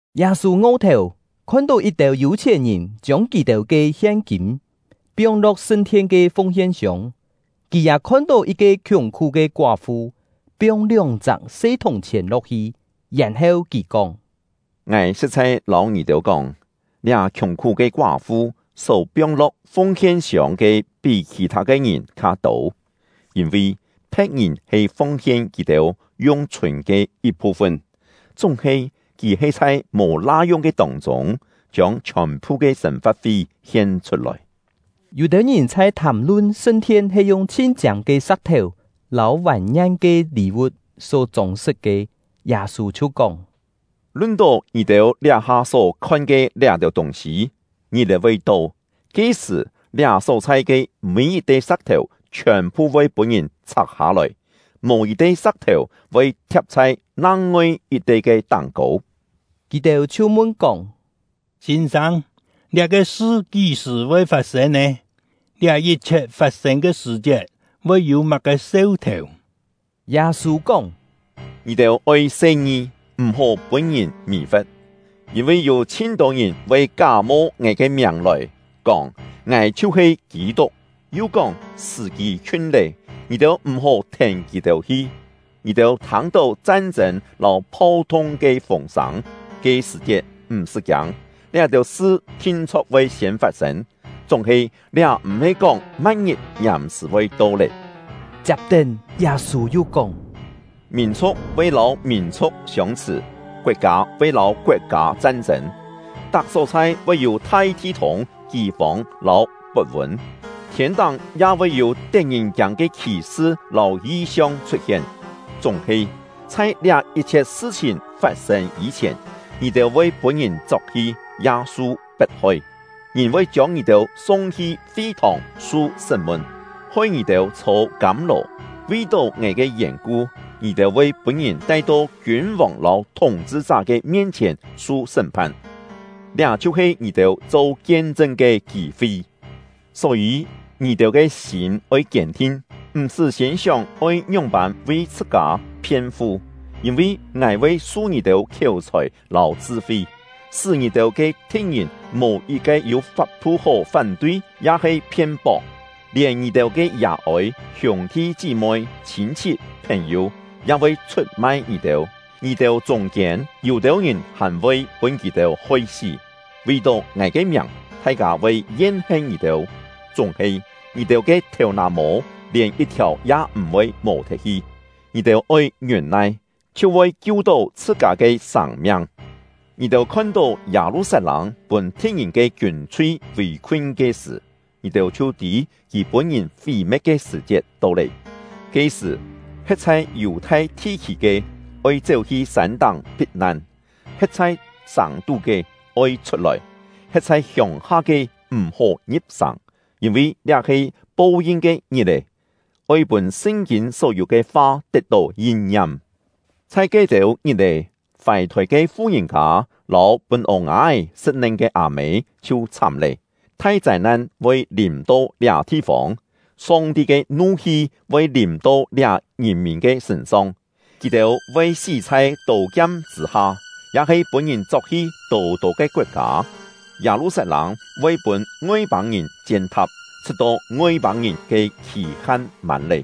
Yâ-sû ngo-thèu, khon-tó yit-têu yû-chhièn-ngìn chiông kì-têu ke hien-kîm piong-lo̍k sṳn-thien ke fung-hien-siông. Kì ya khon-tó yit-ke khiùng-khú ke koá-fu piong lióng-chak se thùng-chhièn lo̍k-hi. Yèn-heu, kì kóng: “Ngài sṳ̍t-chhai lâu ngì-têu kóng, liá khiùng-khú ke koá-fu só piong-lo̍k fung-hien-siông ke pí khì-thâ ke ngìn kha-tô. Yîn-vi phe̍t-ngìn he fung-hien kì-têu yung chhûn ke yit-phu-fun; chúng-he kì he chhai mò la-yung ke tông-chûng, chiông chhiòn-phu ke sên-fa̍t-fi hien-chhut-lòi.” Yû-têu ngìn chhai thàm-lun sṳn-thien he yung chhin-chiâng ke sa̍k-thèu lâu vàn-ngien ke lî-vu̍t só chông-sṳt ke; Yâ-sû chhiu kóng: “Lun-tó ngì-têu liá-ha só khon ke liá-têu tûng-sî: Ngit-è voi to, ke-sṳ̀, liá só-chhai ke mî yit-te sa̍k-thèu chhiòn-phu voi pûn-ngìn chhak-hâ-lòi, mò yit-te sa̍k-thèu voi thia̍p chhai nang-ngoi yit-te ke táng-kô.” Kì-têu chhiu mun-kóng: “Sîn-sâng, liá-ke sṳ kí-sṳ̀ voi fat-sên nè? Liá yit-chhiet fat-sên ke sṳ̀-chiet voi yû má-ke seu-thèu?” Yâ-sû kóng: “Ngì-têu oi se-ngi, m̀-hó pûn-ngìn mì-fe̍t; yîn-vi yû chhin-tô ngìn voi ká-mo ngài ke miàng lòi, kóng: ‘Ngài chhiu-he Kî-tuk!’ yu kóng: ‘Sṳ̀-kî khiun lé!’ Ngì-têu m̀-hó thèn kì-têu hi. Ngì-têu thâng-tó chan-chên lâu phau-thung ke fûng-sâng, ke sṳ̀-chiet m̀-sṳ́ kiâng. Liá-têu sṳ thin-chho̍k voi siên fat-sên; chúng-he liá m̀-he kóng ma̍t-ngit ngiàm-sṳ̀ voi to lé.” Chiap-tén, Yâ-sû yu kóng: “Mìn-chhu̍k voi lâu mìn-chhu̍k siông-chhṳ̀, koet-kâ voi lâu koet-kâ chan-chên; tak só-chhai voi yû thai thi-thûng, kî-fông lâu pot-vûn; thiên-táng ya voi yû tet-ngìn-kiâng ke khì-sṳ lâu yi-siong chhut-hien. Chúng-he, chhai liá yit-chhiet sṳ-chhìn fat-sên yî-chhièn, ngì-têu voi pûn-ngìn chok-hi, ya su pet-hoi; ngìn voi chiông ngì-têu sung-hi fi-thòng su sṳ́m-mun, hoi ngì-têu chhô kâm-lò. Vi-tó ngài ke yèn-ku, ngì-têu voi pûn-ngìn tai-to kiûn-vòng lâu thúng-chhṳ-chá ke mien-chhièn su sṳ́m-phan. Liá chhiu-he ngì-têu cho kien-chṳn ke kî-fi. Só-yî, ngì-têu ke sîm oi kiên-thin, m̀-sṳ́ siên sióng oi ngióng-pân vi chhṳ-kâ phien-fu; yîn-vi ngài voi su ngì-têu khiéu-chhòi lâu chṳ-fi, sṳ́ ngì-têu ke thi̍t-ngìn mò yit-ke yû fap-thu hó fán-tui ya-he phien-pok. Lièn ngì-têu ke yà-ôi, hiûng-thi chí-moi, chhîn-chhit, phèn-yû, ya voi chhut-mai ngì-têu; ngì-têu chûng-kiên yû-têu ngìn hàn voi pûn kì-têu hoi-sí. Vi-tó ngài ke miàng, thai-kâ voi yen-hen ngì-têu; chúng-he, ngì-têu ke thèu-nà-mô lièn yit-thiàu ya m̀-voi mò-thet hi. Ngì-têu oi ngiûn-nai, chhiu voi kiu-tó chhṳ-kâ ke sâng-miang. “Ngì-têu khon-tó Yâ-lu-sat-lâng pûn thi̍t-ngìn ke kiûn-chhui vì-khun ke sṳ̀, ngì-têu chhiu tî kì pûn-ngìn fí-me̍t ke sṳ̀-chiet to lé. Ke-sṳ̀, he̍t chhai Yù-thai thi-khî ke, oi chéu-hi sân-táng phit-nan; he̍t chhai sàng-tú ke, oi chhut-lòi; he̍t chhai hiông-ha ke, m̀-hó ngi̍p-sàng. Yîn-vi liá he ‘Po-yin ke Ngit-è’, oi pûn Sṳn-kîn só-yû ke fa tet-tó yin-ngiam. Chhai ke-têu ngit-è, fài-thôi ke fu-ngìn-kâ lâu pûn ô-nga-é sṳ̍t-nen ke â-mê chhiu chhám lé! Thai châi-nan voi lìm-to liá thi-fông, Song-ti ke nu-hi voi lìm-to liá ngìn-mìn ke sṳ̂n-song. Kì-têu voi sí chhai tô-kiam chṳ̂-ha, ya-he pûn-ngìn chok-hi tô-tô ke koet-kâ. Yâ-lu-sat-lâng voi pûn Ngoi-pâng-ngìn chien-tha̍p, chhṳ̍t-to Ngoi-pâng-ngìn ke khì-han mân lé.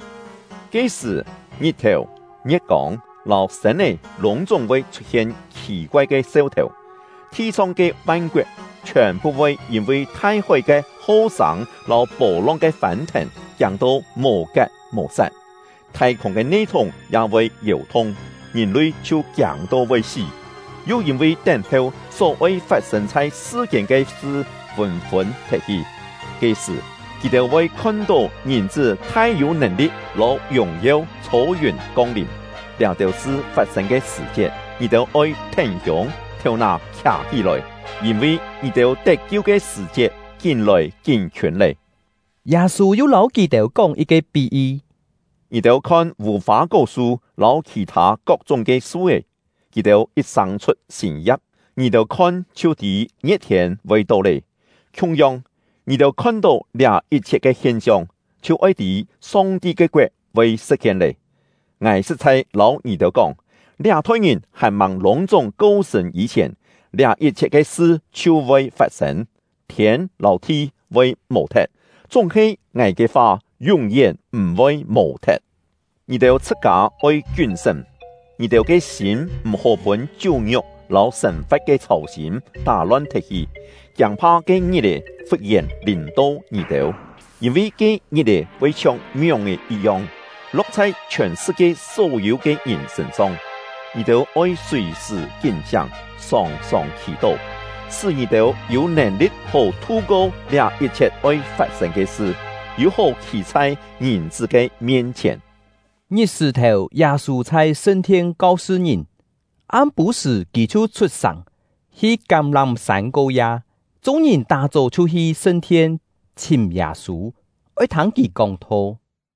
“Ke-sṳ̀, ngit-thèu, ngie̍t-kông, lâu sên-é lûng-chúng voi chhut-hien khì-koai ke seu-thèu. Thi-song ke van-koet chhiòn-phu voi yîn-vi thai-hói ke ho-sâng lâu pô-long ke fân-thèn, kiâng-to mò-kat mò-sat. Thai-khûng ke ne-thúng ya voi yèu-thung, ngìn-lui chhiu kiâng-to voi sí, yu yîn-vi tén-heu só-oi fat-sên chhai sṳ-kiên ke sṳ fûn-fûn thet-hi. Ke-sṳ̀, kì-têu voi khon-tó Ngìn-chṳ́ thai-yû nèn-li̍t lâu yùng-yeu chhô yùn kong-lìm. Liá-têu sṳ fat-sên ke sṳ̀-chiet, ngì-têu oi thén-hiûng, thèu-nà khià-hí-lòi, yîn-vi ngì-têu tet-kiu ke sṳ̀-chiet kín-lòi kín-khiûn lé!” Yâ-sû yu lâu kì-têu kóng yit-ke pí-yi: “Ngì-têu khon vù-fâ-kó-su lâu khì-thâ kok-chúng ke su-é. Kì-têu yit sâng-chhut sîn ya̍p, ngì-têu khon chhiu tî ngie̍t-thiên voi to lé. Khiung-yong, ngì-têu khon-tó liá yit-chhiet ke hien-siong, chhiu oi tî Song-ti ke koet voi sṳ̍t-hien lé. “Ngài sṳ̍t-chhai lâu ngì-têu kóng, liá-thoi ngìn hàn-màng lûng-chúng ko-sṳ̂n yî-chhièn, liá yit-chhiet ke sṳ chhiu voi fat-sên. Thiên lâu thi voi mò-thet, chúng-he ngài ke fa yún-yén m̀-voi mò-thet. “Ngì-têu chhṳ-kâ oi kiún-sṳ́m! Ngì-têu ke sîm m̀-hó pûn chiú-ngiuk lâu sên-fa̍t ke chhâu-sîm tá-lon thet-hi, kiâng-pha ke ngit-è fut-yèn lìm-to ngì-têu; yîn-vi ke ngit-è voi chhiong mióng-è yit-yong, lo̍k chhai chhiòn sṳ-kie só-yû ke ngìn sṳ̂n-song. Ngì-têu oi sùi-sṳ̀ kín-siáng, sòng-sòng khì-tó, sṳ́ ngì-têu yû nèn-li̍t hó thu-ko liá yit-chhiet oi fat-sên ke sṳ, yû-hó khî chhai Ngìn-chṳ́ ke mien-chhièn.” Ngit-sṳ̀-thèu, Yâ-sû chhai sṳn-thien kau-sṳ ngìn; am-pû-sṳ̀, kì chhiu chhut-sàng, hi Kám-lám-sân ko-ya. Chung-ngìn tá-chó chhiu hi sṳn-thien chhìm Yâ-sû, oi thâng kì kóng-tho.